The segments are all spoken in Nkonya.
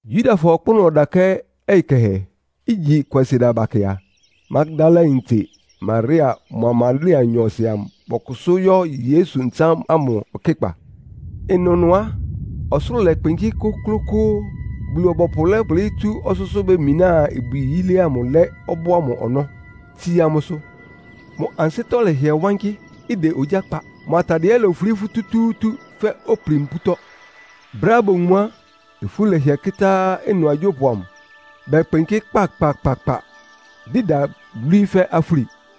Yudafɔ ɔkpʋ́nʋ́ ɔdakɛ́ ɔyɩ kɛhɛ, igyi Kwasieda bakɛ a, Magdalayintse Maria mʋa Maria nyɔɔsɩ amʋ bɔkʋsʋ́ yɔ́ Yesu ntsán ámʋ ɔkɩ́kpa. Ɩnʋnʋ á, ɔsʋlʋ́ʋ lɛkpɩnkɩ́ kʋ́klʋ́kʋ́ʋ́, Bulu-ɔbɔpʋ lɛ́kplɩ́ tsú ɔsʋ́sʋ́ bemináa ibwi yílé ámʋ lɛ́ ɔbɔ́ ámʋ ɔnɔ́, tsíá mʋ́sʋ́. Mʋ ansɩ́tɔ́ lɛhɩɛ wankɩ́, ɩdɛ ogyá kpa. Mʋ atadɩɛ ɛ́ lofulí futútúútú fɛ́ opuli-mpútɔ́. Brɛ́á bowun mʋ a, ifú lɛhɩɛ́ kɩ́tá ɩnʋ agyópʋ amʋ, bɛkpɩnkɩ́ kpakpakpakpa, dɩda, lwíí fɛ́ afúli.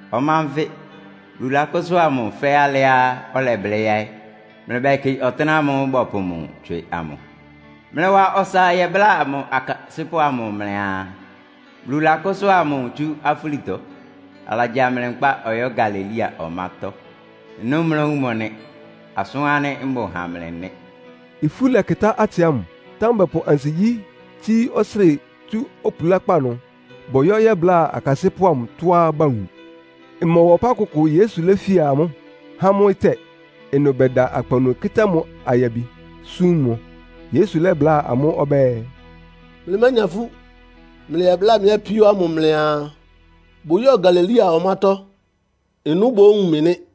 Ɔma nfɩ. Bulu lakʋ́sʋ́a mʋ fɛ́ alɩá ɔlɛblɩ́ yáɩ́. Mlɩbɛkɩ ɔtɩ́nɛ́ ámʋ́ʋ́ bɔpʋ mʋ tswɩ amʋ. Mlɩwa ɔsa yɛbláa mʋ akasɩ́pʋ́ amʋ mlɩaa, Bulu lakʋ́sʋ́a mʋ tsú afúlitɔ. Alagya mlɩ nkpá ɔyɔ́ Galilea ɔmátɔ́. Ɩnʋ́ mlówun mʋ nɩ. Asʋ́n ánɩ́ mbʋ ha mlɩ nɩ́.” Ifú lɛkɩtá atsɩ ámʋ, támɛ bɔpʋ ansigyí tsíí ɔsrɩ́ɩ tsú opulákpá ɩnʋ bɔyɔ́ yɛ́bláa akasɩ́pʋ́ amʋ tɔ́á bawun. Ɩmɔwa ɔpá kʋkʋ Yesu léfía amʋ́, há amʋ́ ɩtɛ́. Ɩnʋ bɛda akpawunu kɩ́tá mʋ ayabi, súm mʋ. Yesu lɛ́bláa amʋ́ ɔbɛ́ɛ, “Mlɩmánya ifú. Mlɩyɛbláa mɩ́ apíó ámʋ mlɩaa, bʋyɔ́ Galilea ɔmátɔ́. Ɩnʋ́ bówun mɩ nɩ́.”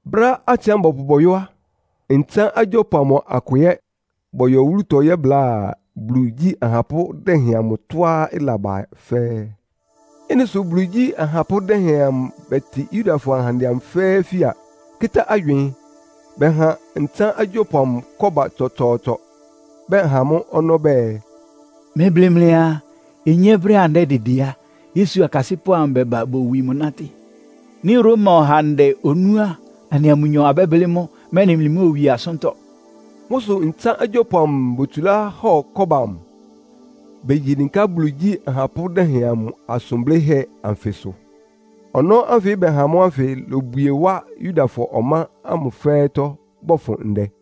Brɛ́á atsɩ ámʋ bɔpʋ bɔyɔ́ á, ntsán agyópʋ amʋ akʋ ɛ́ bɔyɔ wúlutɔ yɛ́bláa Bulu igyí ahapʋ́ dɛhɛn amʋ tɔ́á ɩlaba fɛ́ɛ́. Ɩ́nɩ sʋ Bulu igyí ahapʋ́ dɛhɛn amʋ bɛtɩ Yudafɔ ahandɛ amʋ fɛ́ɛ́ fía, kɩ́tá agywɩɩn. Bɛha ntsán agyópʋ amʋ kɔ́ba tsɔtsɔɔtsɔ. Bɛha amʋ́ ɔnɔ́ bɛɛ, “Mlɩblɩ mlɩaa, ‘Onyé, brɛ́á anɩdɛ́dɩdɩ á, Yesu akasɩ́pʋ́ amʋ bɛ́ba bowi mʋ nátɩ́.’ Nɩ́ Roma ɔhandɛ onú á, anɩa mʋnyɔ abɛ́blɩ́ mʋ́, mɛ́nɩ mlɩmóowie asʋ́ntɔ́.” Mʋ́ sʋ ntsán agyópʋ amʋ botsulá hɔ kɔ́ba amʋ, begyi dɩnká Bulu igyí ahapʋ́ dɛhɛn amʋ asʋn blɩ́hɛ́ anfɩsʋ. Ɔnɔ́ ánfɩ bɛha amʋ́ ánfɩ lobwie wá Yudafɔ ɔmá ámʋ fɛ́ɛ́tɔ́ bɔfʋn ndɛ.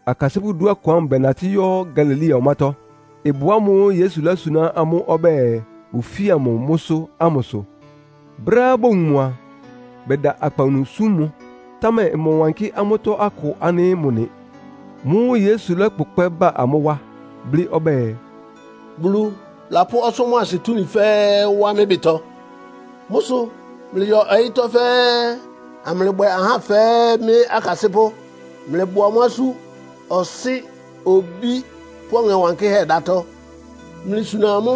Akasɩ́pʋ́ dúɔkʋn ámʋ bɛnatɩ́ yɔ́ Galilea ɔmátɔ́, ɩbʋ ámʋ́ʋ́ Yesu lósuná amʋ́ ɔbɛ́ɛ bʋfía mʋ mʋ́sʋ́ ámʋsʋ. Brɛ́á bowun mʋ a, bɛda akpawunu súm mʋ, támɛ ɩmɔwankɩ́ amʋ́tɔ́ akʋ ánɩ́ mʋ nɩ. Mʋ́ʋ́ Yesu lɔ́kpʋkpɛ́ ba amʋ́ wá, blɩ́ ɔbɛ́ɛ, “Bulu lapʋ́ ɔsʋ́ mʋ́a asɩ túmi fɛ́ɛ́ wá mɩ́ ɩbɩtɔ. Mʋ́ sʋ mlɩyɔ ɔyɩ́tɔ́ fɛ́ɛ́, amlɩbwɛ ahá fɛ́ɛ́ mɩ́ akasɩ́pʋ́. Mlɩbɔ amʋ́ asú Ɔsɩ́, Obí pʋ́ Ɔŋɛ Wankɩ́hɛ́ dátɔ́. Mlɩsuna amʋ́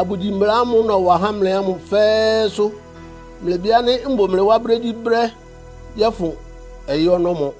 abʋgyi mbla ámʋ́ʋ́ nɔwa há mlɩ ámʋ fɛ́ɛ́sʋ́. Mlɩbɩ ánɩ́ mbʋ mlɩ wá brégyíbrɛ́, yɔ́fʋn ɔyɩ́ ɔnɔ́mɔ.”